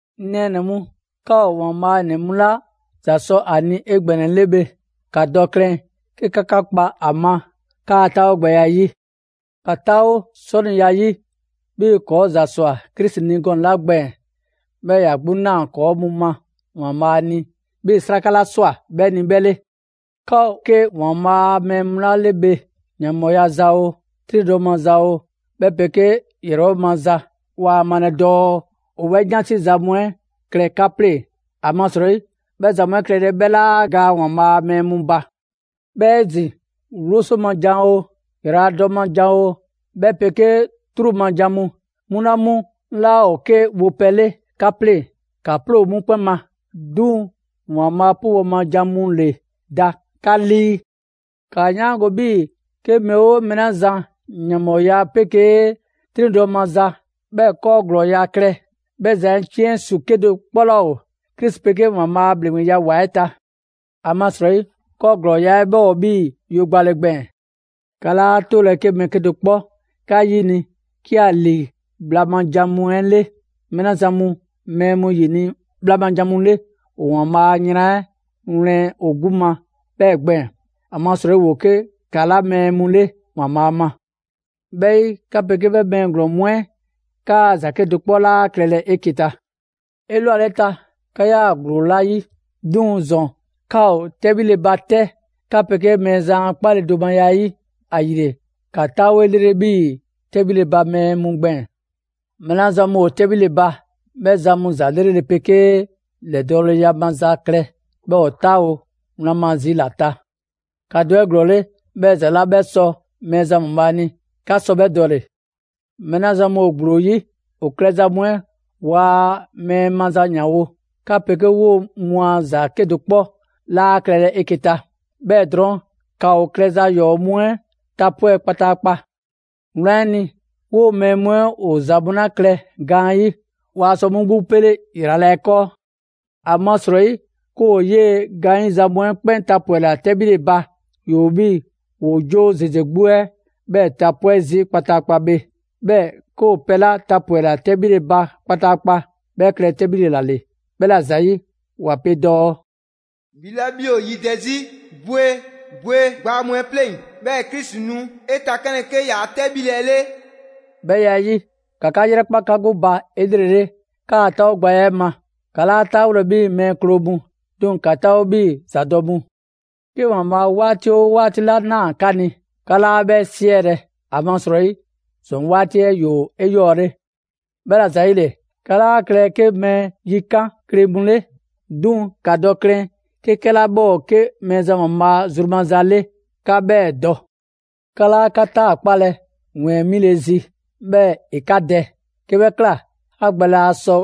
'Ŋ nɛɛnɛ‑ mu, 'ka ‑o ‑Waanbhaa' ‑nɛ mu 'la ‑za sɔ ‑a ni 'egbɛnɛle bhe, ‑ka dɔ klɛn 'ke 'ka 'ka kpa ‑a ma 'kaa 'taawogbɛya 'ɛ 'yi. ‑Ka 'taawo 'sɔniya 'yi, 'bhii‑ ‑kɔɔ' ‑za ‑swa Krisi ni gɔnɛ‑ 'la gbɛɛn‑, 'bhɛɛ‑ ‑ya 'gbu 'naa‑ ‑kɔɔ' mu ma ‑Waanbhaa' ni 'bhii‑ 'sraka 'la ꞊swa 'bhɛ ni 'bhɛ 'le. 'Ka ‑o 'ke ‑Waanbhaa' a mɛɛ mu 'la le bhe, ‑yanbhɔɔya za oo, 'triŋdɔ‑ maza oo 'bhɛ 'pegee ‑yrɛbhɔ' maza, waa malɛ dɔɔ ‑o 'bhɛ 'yansi za mu 'ɛ klɛ 'ka 'pleŋ‑, ‑amasrɔyi, 'bhɛ ‑za mu 'ɛ klɛle 'ɛ 'bhɛ 'laa gaa ‑Waanbhaa' a mɛɛ mu ba. 'Bhɛɛ‑ 'ezin‑ 'wloso ma jan oo, ‑yraladɔ ma jan oo, 'bhɛ 'pegee 'truu‑ ma jan mu, 'mu 'la 'mu 'laa ‑o 'ke wopɛ 'le 'ka 'pleŋ‑, ‑ka 'ploo 'mu 'kpɛn ma. 'Duŋ‑ ‑Waanbhaa' 'pubɔ‑ ma jan mu ‑le da 'ka 'lii. ‑Kaa 'yaango‑ 'bhii‑ 'ke mɛɛ 'oo mɛɛ 'la zan ‑yanbhɔɔya 'pegee 'triŋdɔ‑ maza, 'bhɛɛ‑ 'kɔɔ ‑glɔɔya' klɛ, 'bhɛ zan 'ɛ 'ciɛn ‑su 'kedo‑ 'kpɔ 'laa ‑o Krisi 'pegee ‑Waanbhaa' a ‑bhleŋgbeya ‑wa 'ɛ ta. ‑Amasrɔyi 'kɔɔ ‑glɔɔya' 'ɛ 'bhɛ ‑o 'bhii‑ yo gbale gbɛɛn‑. 'Ka 'laa 'tolɛ‑ 'ke mɛɛ 'kedo‑ 'kpɔ 'ka 'yini‑ 'ke ‑a ‑lii bhla ma ‑jan mu 'ɛ 'le. Mɛɛ 'la zan mu mɛɛ mu ‑yini' bhla ma jan mu 'le ‑o ‑Waanbhaa' a yran 'ɛ wlɛn ‑o 'gbu ma 'bhɛɛ‑ gbɛɛn‑. ‑Amasrɔyi ‑woo 'ke ‑kala' mɛɛ mu 'le ‑Waanbhaa' ma. 'Bhɛ 'yi, 'ka 'pegee 'bhɛ mɛɛ ‑glɔɔn mu 'kaa‑ ‑za 'kedo‑ 'kpɔ laa klɛlɛ 'eke‑ ta. 'Elwaleta, 'ka 'yaa‑ ‑gblo ‑la ‑yi; 'duŋ‑ ‑zɔn 'ka ‑o 'tɛbhile ba 'tɛ 'ka 'pegee Mɛɛzan a 'kpaledomaya 'ɛ 'yi. ‑Ayile ‑ka 'taawo 'elrele 'bhii‑ 'tɛbhile ba mɛɛ mu gbɛɛn‑. Mɛɛ 'la zan mu ‑o 'tɛbhile ba, 'bhɛ zan mu ‑za 'lrele‑ 'pegee ‑lɛdɔɔleya maza klɛ, 'bhɛɛ‑ ‑o 'taawo‑ wlan ma zi ‑la ta. ‑Ka dɔ 'eglɔɔle, 'bhɛɛ‑ ‑za 'la 'bhɛ sɔ Mɛɛzan ‑Waanbhaa' ni, 'ka sɔ 'bhɛ dɔle‑. Mɛɛ 'la zan mu ‑o ‑gblo 'yi, ‑o klɛza mu 'ɛ waa mɛɛ maza ‑yanwo'; ka 'pegee 'woo mu a ‑za 'kedo‑ 'kpɔ laa klɛlɛ 'eke‑ ta. 'Bhɛɛ‑ drɔɔn', ‑ka ‑o klɛza ‑yɔɔ' mu 'ɛ tapwɛ' kpataakpa. Wlan 'ɛ ni, 'woo‑ mɛɛ mu 'ɛ ‑o ‑za mu 'la klɛ gaanyi', waa sɔ 'mu 'gbu 'pele ‑yrala' 'ɛ 'kɔɔ. ‑Amasrɔyi 'ke ‑o 'yee‑ gaanyiza mu 'ɛ 'kpɛn tapwɛla 'tɛbhile ba, ‑yoo 'bhii‑ ‑woo 'joo ‑zeze 'gbu 'ɛ 'bhɛɛ‑ tapwɛ' zii' kpataakpa bhe. 'Bhɛɛ‑ 'ke ‑o pɛ 'la tapwɛla 'tɛbhile ba kpataakpa, 'bhɛ klɛ 'tɛbhile ‑la ‑le. 'Bhɛla‑ ‑zayi' ‑wa pe dɔɔ: «'Bhi 'la 'bhi ‑o yidɛ 'zi, bwe! Bwe gbaa mu 'ɛ 'pleŋ‑; 'bhɛɛ‑ Krisi nu 'e takanlɛ 'ke ‑yaa' 'tɛbhile 'ɛ 'le.» 'Bhɛ ya 'ɛ 'yi, ‑ka 'ka 'yrɛkpa 'ka 'gbu ba 'elrele 'kaa‑ 'taawogbɛya 'ɛ ma. 'Ka 'laa 'taawolɛ 'bhii‑ mɛɛ kloo mu, 'duŋ‑ ‑ka 'taawo 'bhii‑ ‑zadɔ' mu. 'Ke ‑Waanbhaa' 'waati 'oo 'waati 'la ꞊naa 'ka ni, 'ka 'laa 'bhɛ 'siɛlɛ‑; ‑amasrɔyi, ‑zɔn 'waati 'ɛ ‑yoo 'eyɔɔle. 'Bhɛla‑ ‑zayile, 'ka 'laa klɛlɛ 'ke mɛɛ yikan' kle mu 'le, 'duŋ‑ ‑ka dɔ klɛn 'ke 'kɛla 'bhɛ ‑o 'ke Mɛɛzan ‑Waanbhaa' zru maza 'le 'ka 'bhɛɛ‑ dɔ. 'Ka 'laa 'ka 'taakpalɛ ‑wɛɛn 'mile‑ zi, 'bhɛɛ‑ ‑e 'ka dɛ: 'ke bhɛ ꞊kla, 'ka gbɛ laa sɔ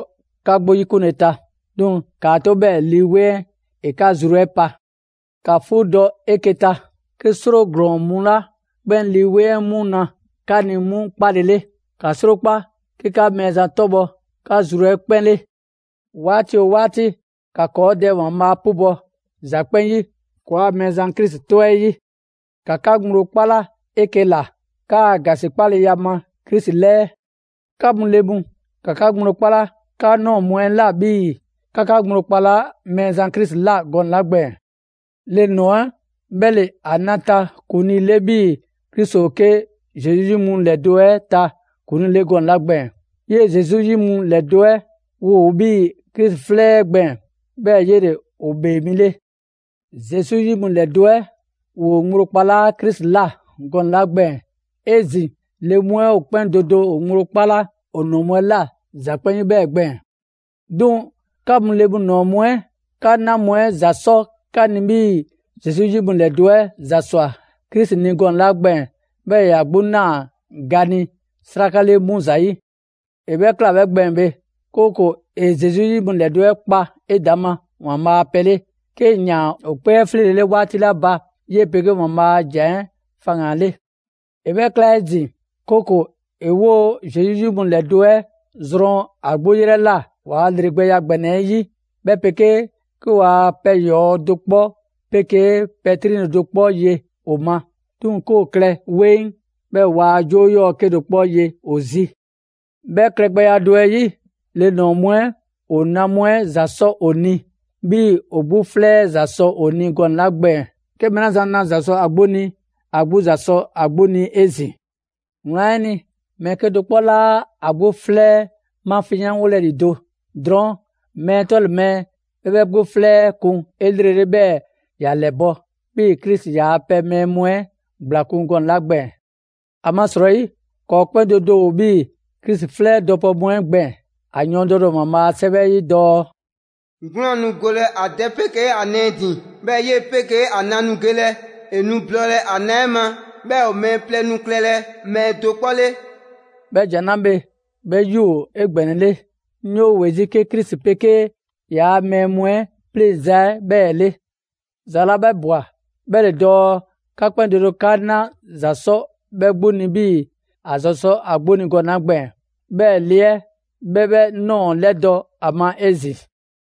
'ka 'gbu 'yikunle ta. 'Duŋ‑ ‑kaa 'to 'bhɛɛ‑ Lii 'Weŋ 'ɛ ‑e 'ka zru 'ɛ pa. ‑Ka 'fuudɔ‑ 'eke‑ ta 'ke 'sro ‑glɔɔn mu 'la 'kpɛn Lii 'Weŋ 'mu na 'ka ni 'mu 'kpalele. ‑Ka 'srokpa 'ke 'ka Mɛɛzan 'tɔbhɔ 'ka zru 'ɛ 'kpɛn 'le. 'Waati 'oo 'waati, ‑ka ‑kɔɔ' Dɛ ‑Waanbhaa' 'pubɔ‑ ‑za 'kpɛn 'yi ‑kɔɔa' Mɛɛzan Krisi 'tɔ 'ɛ 'yi. ‑Ka 'ka ŋgblo 'kpala 'eke‑ ‑la 'kaa‑ ‑gasikpaleya ma Krisi 'lɛɛ. 'Ka mu le mu, ‑ka 'ka ŋgblo 'kpala 'ka ꞊nɔɔ mu 'ɛ ꞊la 'bhii‑ 'ka 'ka ŋgblo kpalaa' Mɛɛzan Krisi ꞊la gɔnɛ‑ 'la gbɛɛn‑. Le ‑nɔɔ 'ɛ 'bhɛ ‑le ‑a na ta ‑kuŋlii 'le 'bhii‑ Krisi ‑o 'ke Zesu 'yi mu ‑lɛdo' 'ɛ ta ‑kuŋlii 'le gɔnɛ‑ 'la gbɛɛn‑. 'Yee‑ Zesu 'yi mu ‑lɛdo' 'ɛ ‑woo 'bhii‑ Krisi 'flɛ 'ɛ gbɛɛn‑, 'bhɛɛ‑ 'yele‑ ‑o ‑Bhee Mi 'le. Zesu 'yi mu ‑lɛdo' 'ɛ ‑woo ŋgblo kpalaa' Krisi ꞊la gɔnɛ‑ 'la gbɛɛn‑, 'ezin‑ le mu 'ɛ ‑o 'kpɛn do do ‑o ŋgblo 'kpala ‑o ‑nɔɔ mu ꞊la ‑za 'kpɛn 'yi 'bhɛɛ‑ gbɛɛn‑. 'Duŋ‑ 'ka mu le ‑nɔɔ mu 'ɛ, 'ka 'na mu 'ɛ ‑za 'sɔ 'ka ni 'bhii‑ Zesu 'yi mu ‑lɛdo' 'ɛ ‑za ꞊swa Krisi ni gɔnɛ‑ 'la gbɛɛn‑ 'bhɛɛ‑ ‑ya 'gbu ꞊naa ga ni 'sraka 'le 'mu ‑zayi'. ‑E 'bhɛ ꞊kla 'bhɛ gbɛɛn‑ bhe, 'kooko‑ ‑e Zesu 'yi mu ‑lɛdo' 'ɛ kpa 'edaŋma ‑Waanbhaa' a pɛ 'le, 'kee‑ ‑yaan ‑o 'kpee 'ɛ 'fleelele 'waati 'la ba ‑yi 'pegee ‑Waanbhaa' a ‑Jan 'ɛ faŋgan‑ 'le. ‑E 'bhɛ ꞊kla 'ezin‑, 'kooko‑ ‑e 'woo‑ Zesu 'yi mu ‑lɛdo' 'ɛ zrɔn ‑a 'gbu 'yrɛ ꞊la waa ‑lreleya ‑gbɛnɛ 'ɛ 'yi, 'bhɛ 'pegee 'ke ‑waa pɛ ‑yɔɔ' do 'kpɔ 'pegee pɛ 'triŋdɔle do 'kpɔ ye ‑o ma. 'Duŋ‑ 'ke ‑o klɛ 'weŋ, 'bhɛɛ‑ waa 'joo 'yɔɔ‑ 'kedo‑ 'kpɔ ye ‑o zi. 'Bhɛ klɛgbɛya do 'ɛ 'yi, le ‑nɔɔ mu 'ɛ ‑o na mu 'ɛ ‑za 'sɔ ‑o ni, 'bhii‑ ‑o 'gbu 'flɛ 'ɛ ‑za sɔ ‑o 'gbu ni gɔnɛ‑ 'la gbɛɛn‑. 'Ke mɛɛ 'la zan na ‑za sɔ ‑a 'gbu ni, ‑a 'gbu ‑za sɔ ‑a 'gbu ni 'ezin‑. Wlan 'ɛ ni, mɛɛ 'kedo‑ 'kpɔ 'laa ‑a 'gbu 'flɛ mafinyanwolɛ ‑lido'; drɔɔn' mɛɛ 'tɔle‑ mɛɛ, 'bhɛ 'bhɛ 'gbu 'flɛ 'ɛ kun 'elrele 'bhɛɛ‑ ‑ya ‑lɛbɔ', 'bhii‑ Krisi ‑yaa' pɛ mɛɛ mu 'ɛ ‑gblakun' gɔnɛ‑ 'la gbɛɛn‑. ‑Amasrɔyi, ‑kɔɔ' 'kpɛn do do ‑o 'bhii Krisi 'flɛ dɔpɛ mu 'ɛ gbɛɛn‑. ‑A yɔɔndɛle ‑o ‑Waanbhaa' a 'Sɛwɛ 'ɛ 'yi dɔɔ: «'Gwlaan‑ nu golɛ ‑a dɛ 'pegee ‑a nɛɛ ‑din, 'bhɛɛ‑ 'yee‑ 'pegee ‑a na nu gelɛ; ‑e nu blɔɔlɛ‑ ‑a na 'ɛ ma, 'bhɛɛ‑ ‑o mɛɛ plɛ nu klɛlɛ mɛɛ do 'kpɔ 'le.» 'Bhɛ ‑jan 'la bhe, 'bhɛ 'yi ‑o 'egbɛnɛle; 'ŋ 'yoo‑ ‑we 'zi 'ke Krisi 'pegee ‑yaa' mɛɛ mu 'ɛ 'pleŋza‑ 'ɛ 'bhɛɛ‑ 'le. ‑Za 'la ꞊bwa 'bhɛ ‑le dɔɔ 'ka 'kpɛn do do 'ka 'na ‑za 'sɔ 'bhɛ 'gbu ni 'bhii‑ ‑a ‑za sɔ ‑a 'gbu ni gɔnɛ‑ 'la gbɛɛn‑. 'Bhɛɛ‑ le 'ɛ, 'bhɛ 'bhɛ ꞊nɔɔ 'lɛdɔ‑ ‑a ma 'ezin‑.